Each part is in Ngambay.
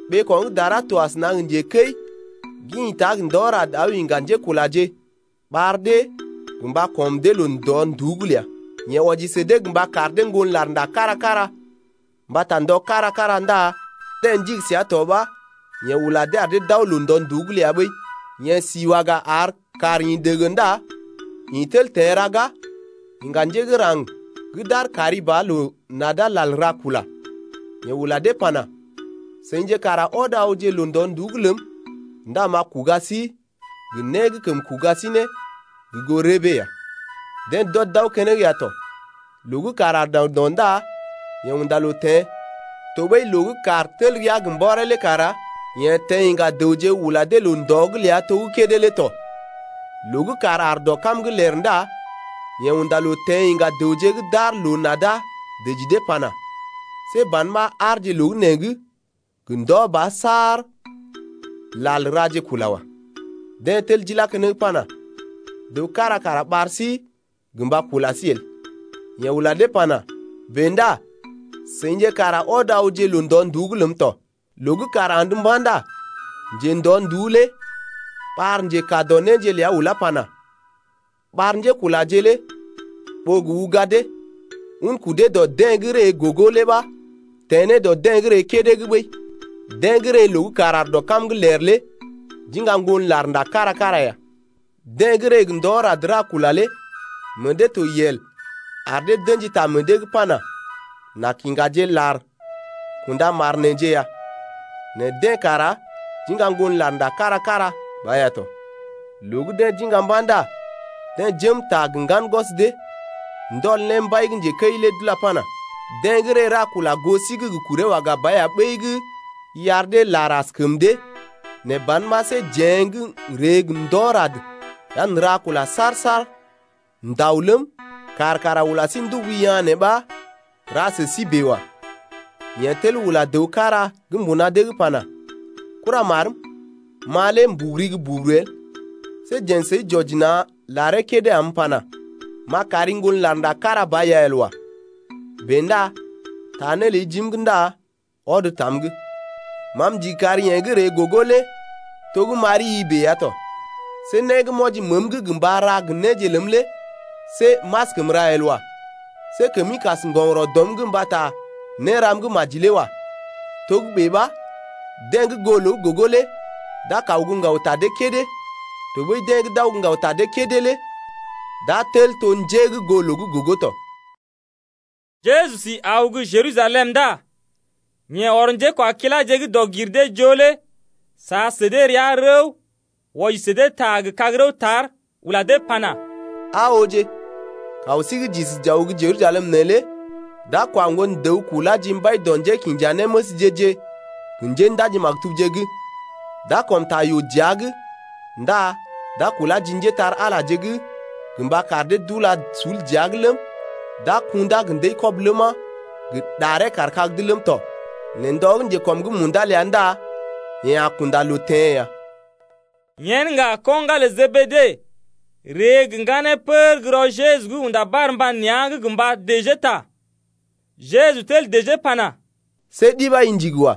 Ɓeeko̰ gə́ dara to asəna gə njekəi gə́ ḭta gə ndɔ rad aw iŋga njékulaje ɓar dee gə mba kɔm dee loo-ndɔ-nduú’g ləa. Yeḛ wɔji sə dee gə mba kar dee ŋgon larnda kára-kára mbata ndɔje kára-kára ndá deḛ ndigi səa to ɓa yeḛ ula dee ar dee d’aw loo-ndɔ-nduú’g ləa ɓəi. Yeḛ si waga ar kàr ḭ dege ndá ḭ tel teḛ raga, iŋga njé gə́ raŋg gə́ d’aar kari ba loo-nada lal ra kula. Yeḛ ula dee pana: Seḭje kara ɔd awje loo-ndɔ-nduú’g ləm ndá m’a kuga sí gə né gə́ kəm kuga sí ne gə goo rəbee ya. Deḛ d’ɔd d’aw keneŋ ya tɔ. Loo gə́ kàr aar daŋdɔ ndá yeḛ unda loo teḛ tɔɓəi, loo gə́ kàr tel rəa gə mbɔree lé kara yeḛ teḛ iŋga dəwje ula dee loo-ndɔ’g ləa to gə́ kédé lé tɔ. Loo gə́ kàr aar dɔ kam’g ler ndá yeḛ unda loo teḛ iŋga dəwje gə́ d’aar loo-nada dəji dee pana: See ban ɓa aarje loo gə́ nee’g gə ndɔ ba saar lal raje kula wa. Deḛ tel d’ilá keneŋ pana: Dəw kára kara ɓar sí gə mba kula sí el. Yeḛ ula dee pana: Bèe ndá seḭje kara ɔd awje loo-ndɔ-nduú’g ləm tɔ. Loo gə́ kàr andə mba̰ ndá njendɔ-nduú lé ɓar njekaa dɔ néje ləa ulá pana: Ɓar njékulaje lé ɓó gə uga dee, un kudee dɔ deḛ gə́ ree gogo’g lé ɓa teḛ ne dɔ deḛ gə́ ree kédé’g ɓəi. Deḛ gə́ ree loo gə́ kàr aar dɔ kam’g ler lé d’iŋga ŋgon larnda kára-kára ya. Deḛ gə́ ree gə ndɔ rad ra kula lé meḛ dee to yel, ar dee d’ə̰ji ta meḛ dee’g pana: N’a kiŋgaje lar kunda mar neḛje ya, nɛ deḛ kara d’iŋga ŋgon larnda kára-kára ba ya tɔ. Loo gə́ deḛ d’iŋga mba̰ ndá deḛ jém ta gə ŋgan gwɔs dee, ndɔl ne mbai gə́ njekəi lé d’ulá pana: Deḛ gə́ ree ra kula goo sí’g gə kuree waga ba ya ɓəi gə́ i ar dee lar askəm dee, nɛ ban ɓa see jeḛ gə́ n’ree gə ndɔ rad ya n’ra kula saar-saar n’dao ləm, kàr kara ula sí ndubu yaa̰ nee ɓa ra sə sí bèe wa. Yeḛ tel ula dəw kára gə́ mbuna dee’g pana: Kuramarm, ma lé m’buguri gə́ buguru el, see jeḛ səi j’wɔji na̰ laree kédé am m’pana: M’a kari ŋgon larnda kára ba ya el wa. Bèe ndá taa né ləi jim’g ndá ɔd tam’g. Ma m’ndigi kar yeḛ gə́ ree gogo lé to gə́ m’ari-i bèe ya tɔ. See né gə́ m’wɔji məəm’g gə mba ra gə néje ləm lé see m’askəm ra el wa. See kəmi kas ŋgɔgərɔ dɔm’g mbata néram gə́ maji lé wa. Togə́bè ɓa deḛ gə́ goo loo gə́ gogo lé d’a kaw gə́ ŋgaw ta dee kédé, tɔɓəi deḛ gə́ d’aw gə́ ŋgaw ta dee kédé lé d’a tel to njé gə́ goo loo gə́ gogo tɔ. Jeju si aw gə́ Jerusalem ndá yeḛ ɔr njékwakiláje gə́ dɔg-gir-dee-joo lé sa sə dee rəa rəw wɔji sə dee ta gə kag-rəw tar, ula dee pana: Aa ooje, kaw sí gə́ j’isi j’aw gə́ Jerusalem neelé d’a kwa Ŋgon-dəw kulá ji mbai dɔ njékinjanéməsje-je gə njéndaji-maktubje’g. D’a kɔm ta yoo dəa’g ndá d’a kulá ji njépole-magəje’g gə mba kar dee d’ula sul dəa’g ləm, gə kundá gə ndəi-kɔb ləma, gə ɗaree kaar kag’d ləm tɔ, nɛ ndɔ gə́ njekɔm’g munda ləa ndá yeḛ a kunda loo teḛ ya. Yen ŋga ko̰ ŋgalə Jebede ree gə ŋganeeje pər gə́ rɔ Jeju’g unda barmba nea̰’g gə mba dəjee ta, Jeju tel dəjee pana: See ɗi ɓa i ndigi wa.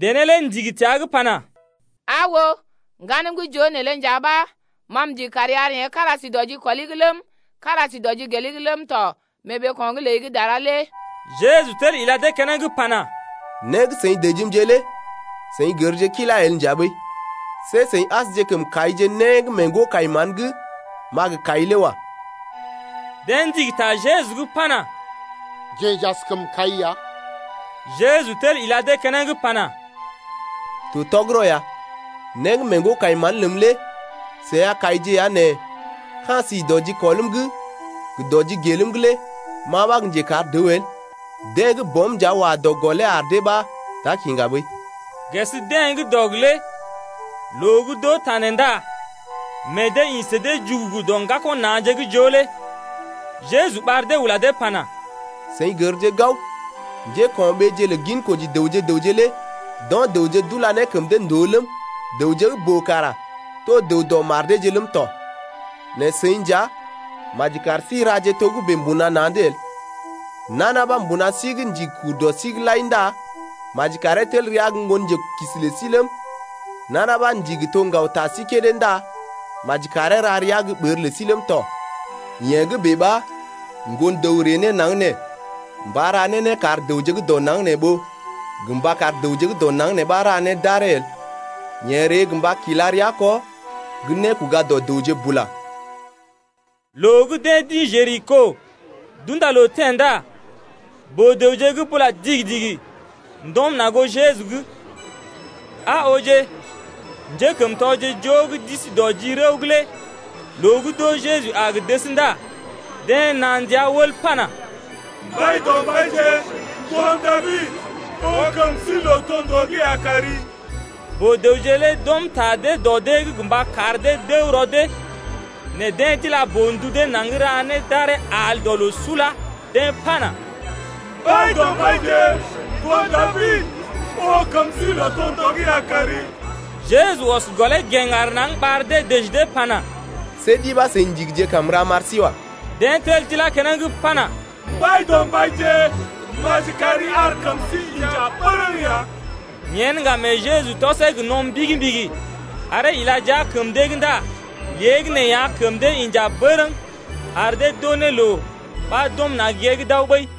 Dené lé ndigi təa’g pana: Aa oo, ŋganmje gə́ joo neelé nja ɓa ma m’ndigi kari ar yeḛ gə́ kára si dɔ jikɔli’g ləm, kára si dɔ jigeli’g ləm tɔ mee ɓeeko̰’g ləi gə́ dara lé. Jeju tel ila dee keneŋ pana: Né gə́ seḭ dəjimje lé seḭ gərje kilá el nja ɓəi. See seḭ asje kəm kaije né gə́ mee ŋgo-kai-mán gə́ m’a gə kai lé wa. Deḛ ndigi ta Jeju’g pana: Jeḛ j’askəm kai ya. Jeju tel ila dee keneŋ pana: To tɔgərɔ ya, né gə́ mee ŋgo-kai-mán’g ləm lé seḭ a kaije ya nɛ ka̰ si dɔ jikɔlm’g gə dɔ jigelm’g lé ma ɓa gə́ njekar dəw el. Deḛ gə́ Bɔm nja wa dɔ gɔlee ar dee ɓa d’a kiŋga ɓəi. Ges dee gə́ dɔg lé loo gə́ d’oo ta nee ndá meḛ dee ḭ sə dee jugugu dɔ ŋgako̰ na̰je gə́ joo lé. Jeju ɓar dee ula dee pana: Seḭ gərje gao, njéko̰ɓeeje lə ginkoji dəwje gə raŋg lé d’o̰ dəwje d’ula ne kəm dee ndòo ləm, dəwje gə́ boo kara to dəw dɔ mar deeje ləm tɔ. Nɛ seḭ nja maji kar sí raje togə́bè mbuna na̰’d el. Nana ɓa mbuna sí’g ndigi kur dɔ sí’g lai ndá maji karee tel rəa gə́ ŋgonjelookisi lə sí ləm. Nana ɓa ndigi to ŋgaw ta sí kédé ndá maji karee ra rəa gə́ ɓər lə sí ləm tɔ. Yee gə́ bèe ɓa Ŋgon-dəw ree ne naŋg nee mba ra ne né kar dəwje gə́ dɔ naŋg nee ɓó gə mba kar dəwje gə́ dɔ naŋg nee ɓa ra né d’aree el. Yeḛ ree gə mba kila rəa kɔ gə́ nékoga dɔ dəwje bula ya. Loo gə́ deḛ d’ḭ Jeriko d’unda loo teḛ ndá boo-dəwje gə́ bula digi-digi ndɔm na̰ goo Jeju’g. Aa ooje, njékəmtɔje joo gə́ d’isi dɔ ji rəw’g lé loo gə́ d’oo Jeju a gə dəs ndá deḛ naa ndia wəl pana: Mbaidɔmbaije, ŋgon Dabid, oo kəm sí lootondoo’g ya kari. Boo-dəwje lé d’ɔm ta dee dɔ dee’g gə mba kar dee d’əw rɔ dee nɛ deḛ d’ila boo-ndu dee naŋg ra ne d’aree al dɔ loo sula, deḛ pana: Mbaidɔmbaije, ŋgon Dabid, oo kəm sí lootondoo’g ya kari. Jeju ɔs gɔlee gèŋ aar naŋg ɓar dee dəji dee pana: See ɗi ɓa seḭ ndigije kam m’ra m’ar sí wa. Deḛ tel d’ilá keneŋ pana: Mbaidɔmbaije, maji kari ar kəm sí inja bərəŋ ya. Yen ŋga mee Jeju tɔsee gə no̰ mbigi-mbigi aree ila jia kəm dee’g ndá léegəneeya, kəm dee inja bərəŋ ar dee d’oo ne loo ɓa d’ɔm na̰ gée’g d’aw ɓəi.